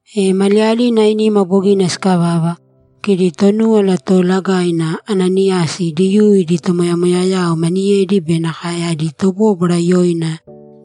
E maliyalina ainima bogina sikavava, kidi Tonúwala Toolagaina, Ananiyasi, Diyuu idi tomoyamoyayao maniyedi be nakae adi tobóbwara yoina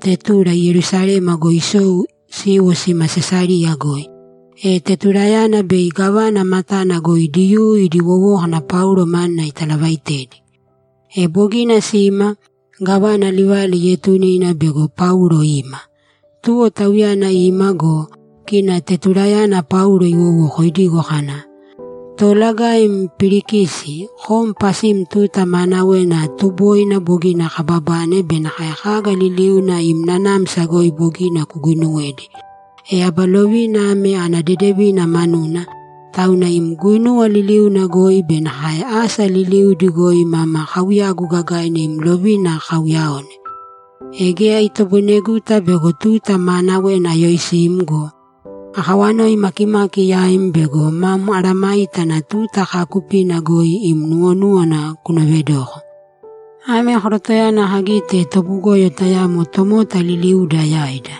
Tetulo Yerusalema goi sisou siiwo sima Sesariya goi, e Tetuloyana bei gávana matana goi Diyuu idi wowókana Paulo manuna italavaitedi. E bogina sima, gávana livala ietune ina bego Paulo ima. Tuwo tauyana ima go, kina Tetuloyana Paulo iwowoko idigo kana, ‘Toolagaim Pilikisi, kom pasim tuta maanawena tuboina bogina kababane be nakae kaga liliuna im nanamsa goi bogina kuguinuwedi, e aba lovina ame ana dedevina manuna, tauna im guinuwa liliuna goi be nakae asa liliudi goi mama kauyagu gagaina im lovina kauyaone. E geya itoboineguta bego tuta maanawena ayoisim go, akawanoi makimaki yaim bego mam mesayágana tuta kaakupina goi ima nuwonúwana kunovedoko. Ame korotoyana kagite tobugoyo tayamo tomota liliuda yaida.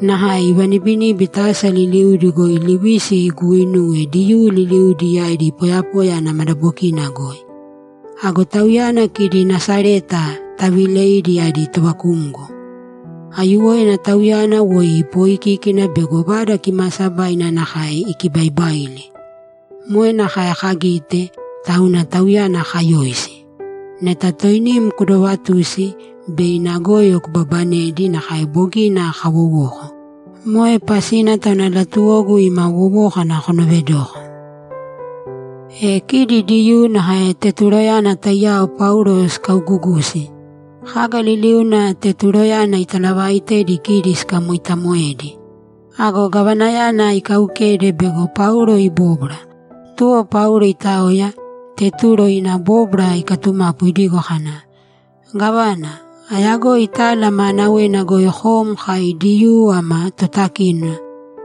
Nakae ivanibiníbita asa liliudi goi livisi iguuinuwe Diyuu liliudi yaidi poyapoya ana madabokina goi. Ago tauyana kidi Nasareta taviileidi adi tovakumgo. Aiyuwoina tauyana woi ipoikíkina bego Vada Kimaasabaina nakae ikibaibaili! Moe nakae kagite, tauna tauyana kayoisi. Neta toinim kudovatusi, bei ina goyo kubabanedi nakae bogina kawowoko. Moe pasina tauna latuwogu ima wowókana kunovedoko.’ E kidi Diyuu nakae Tetuloyana taiyao Paulo sikaugugusi. Kaga liliuna Tetuloyana italavaaitedi kidi sikamoitaamoedi. Ago gavanayana ikaukede bego Paulo ibóbwara. Tuwo Paulo itaoya, Tetulo ina bóbwara ikatumapu idigo kana, ‘Gávana, ayagoi tala maanawena goi kom kai Diyuu ama totakínona,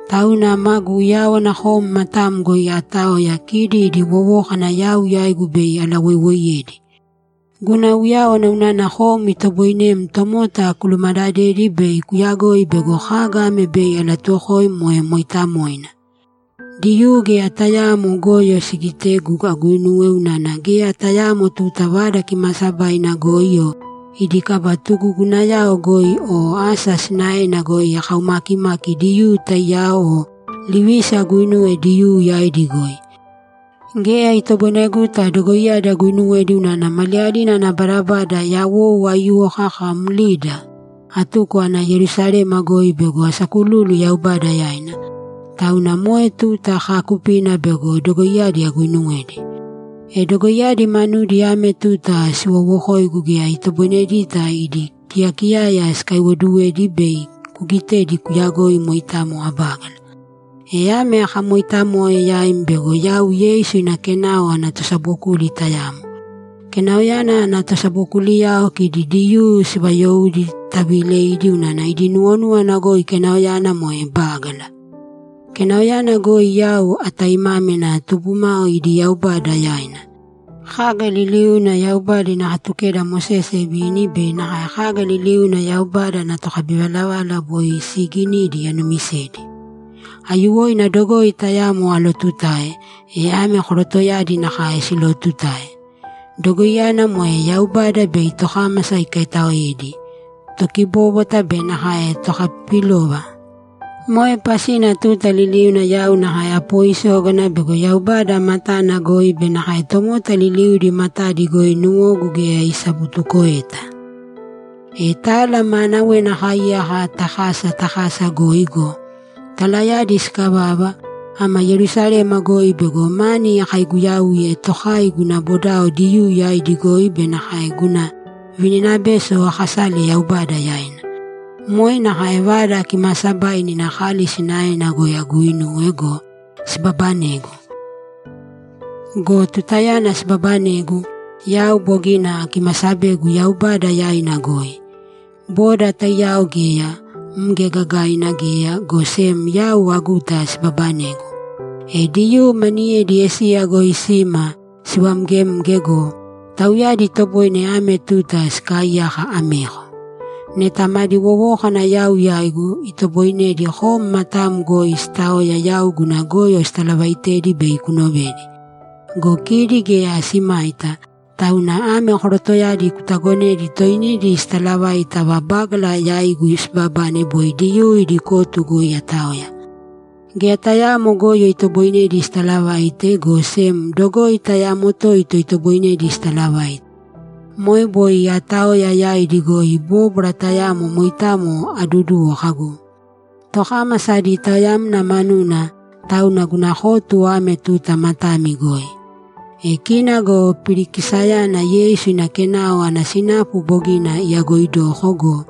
tauna maagu uyáwana kom matam goi aataoya kidi idi wowókana yau yaigu bei alawoiwoiyedi. Guna uyáwana unana kom itoboinem tomota kulumadadedi bei kuyagoi bego kaga ame bei alatuwokoim moe mooitamoina. Diyuu geya tayaamo goyo sigitegu aguinuwe unana geya tayaamo tuta Vada Kimaasabaina goi o idi kaba tugugunayao goi o asa sinaena goi akaumakimaki Diyuu taiyao o livisi aguinuwe Diyuu yaidi goi. Geya itoboineguta dogoiyadi aguinuwedi unana maliyalina ana badabada yawou aiyuwo kaka mlida, atuko ana Yerusalema goi bego asakululu Yaubada yaina, tauna moe tuta kaakupina bego dogoiyadi aguinuwedi. E dogoiyadi manudi ame tuta siwoowokoigu geya itoboinedita idi kiyakiyaya sikaiwoduwedi bei kugitedi kuyagoi moitamo abágala. E ame akamoitamoe yaim bego yau Yeisu ina Kenao ana tosabokuli tayamo. Kenaoyana ana tosabokuliyao kidi Diyuu sivayoudi taviileidi unana idi nuwonúwana goi Kenaoyana moe bágala. Kenaoyana goi yau ataimámina tubumao idi Yaubada yaina. Kaga liliuna Yaubada ina Katukeda Mosese ivini be nakae kaga liliuna Yaubada ana tokabivalavala boi siiginidi anuumisedi. Aiyuwoina dogoi tayamo alootutae, e ame korotoyadi nakae silootutae. Dogoiyana moe Yaubada bei tokámasa ikaitaoedi, tokibóbwata be nakae tokapipilova. Moe pasina tuta liliuna yau nakae apoisógana bego Yaubada matana goi be nakae tomota liliudi matadi goi nuwogu geya isabutukoeta. E tala maanawena akaaiyaka ta kasa ta kasa goi go, talayadi sikavava, ama Yerusalema goi bego mani akaiguyauye tokai guna bodao Diyuu yaidi goi be nakae guna vininabeso akasale Yaubada yaina. Moe nakae Vada Kimaasabaina ina kali sinaena goi aguuinuwe go, sibabanegu. Go tutayana sibabanegu, yau bogina akimasabegu Yaubada yaina goi; boda taiyao geya, mge gagaina geya, go sem yau aguta sibabanegu. E Diyuu maniyedi Esiya goi sima sivamgemge go, tauyadi itoboine ame tuta sikaaiyaka ameko. Neta madi wowókana yau yaigu, itoboinedi kom matam goi sitaoya yau guna goyo sitalavaitedi bei kunovedi. Go kidi geya simaita, tauna ame korotoyadi kutagonēdi toinidi sitalavaita ava bágala yaigu sibabane boi Diyuu idi kotu goi ataoya. Geya tayaamo goyo itoboinedi sitalavaite, go sem dogoi tayamo toito itoboinedi sitalavaite. Moe boi aataoya yaidi goi bóbwara tayamo moitamo aduduwo kagu, “Tokámasa adi taoyamna manuna, tauna guna kotu ame tuta matami goi.”’ E kina go Pilikisiyana Yeisu ina Kenao ana sinapu bogina iyagoidoko go,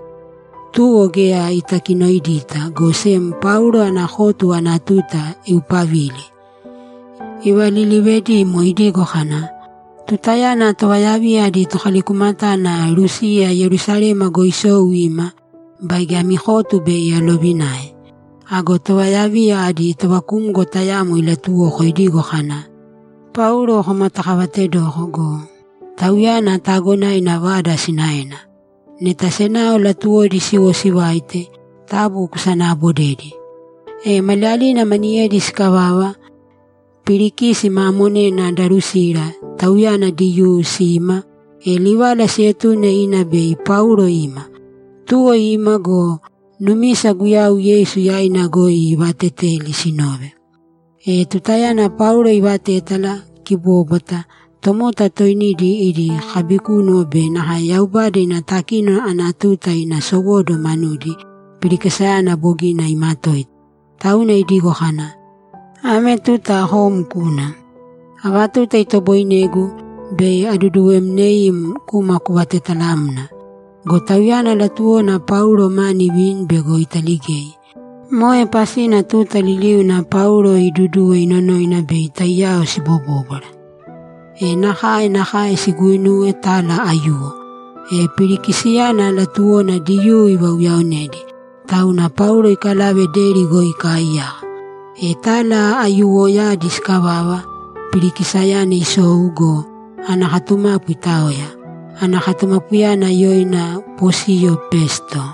tuwo geya itakinoidita, go sem Paulo ana kotu ana tuta iupavile. Ivalilivedimo idigo kana, ‘Tutayana tovayaviya adi tokalikumatana Lusiya Yerusalema goi isou ima, baige ami kotu bei alovinae.’ Ago tovayaviya adi tovakumgo tayamo ilatuwuko idigo kana, ‘Paulo komatakavatedoko go, tauyana taagonaina vada sinaena. Neta senao latuwodi siwo sivaite, taabu kosanaabodēdi.’ E maliyalina maniyedi sikavava, Pilikisi ma monena Darusila, tauyana Diyuu, sima, e livala sietune ina bei Paulo ima. Tuwo ima go, numisa Guyau Yeisu yaina goi ivateteli sinove. E tutayana Paulo ivatétala kibóbwata, tomota toinidi idi kabikúnuwo be nakae Yaubada ina takínona ana tuta ina sowóduwo manudi, Pilikisiyana bogina imatoita, tauna idigo kana, ‘Ame tuta kom kūna. Ava tuta itoboinegu, bei aduduwemneim kuma kuvatetalamna.’ Go tauyana latuwona Paulo mani ivini bego italigei. Moe pasina tuta liliuna Paulo iiduduwe inonoina bei taiyao sibobóbwara. E nakae nakae siguuinuwe tala aiyuwo. E Pilikisiyana latuwona Diyuu ivauyaonedi, tauna Paulo ikalave deri goi ikaaiyaka. E tala aiyuwoyadi sikavava, Pilikisiyana isou go, ana katumapu itaoya. Ana katumapuyana yoina Posiyo Pesto.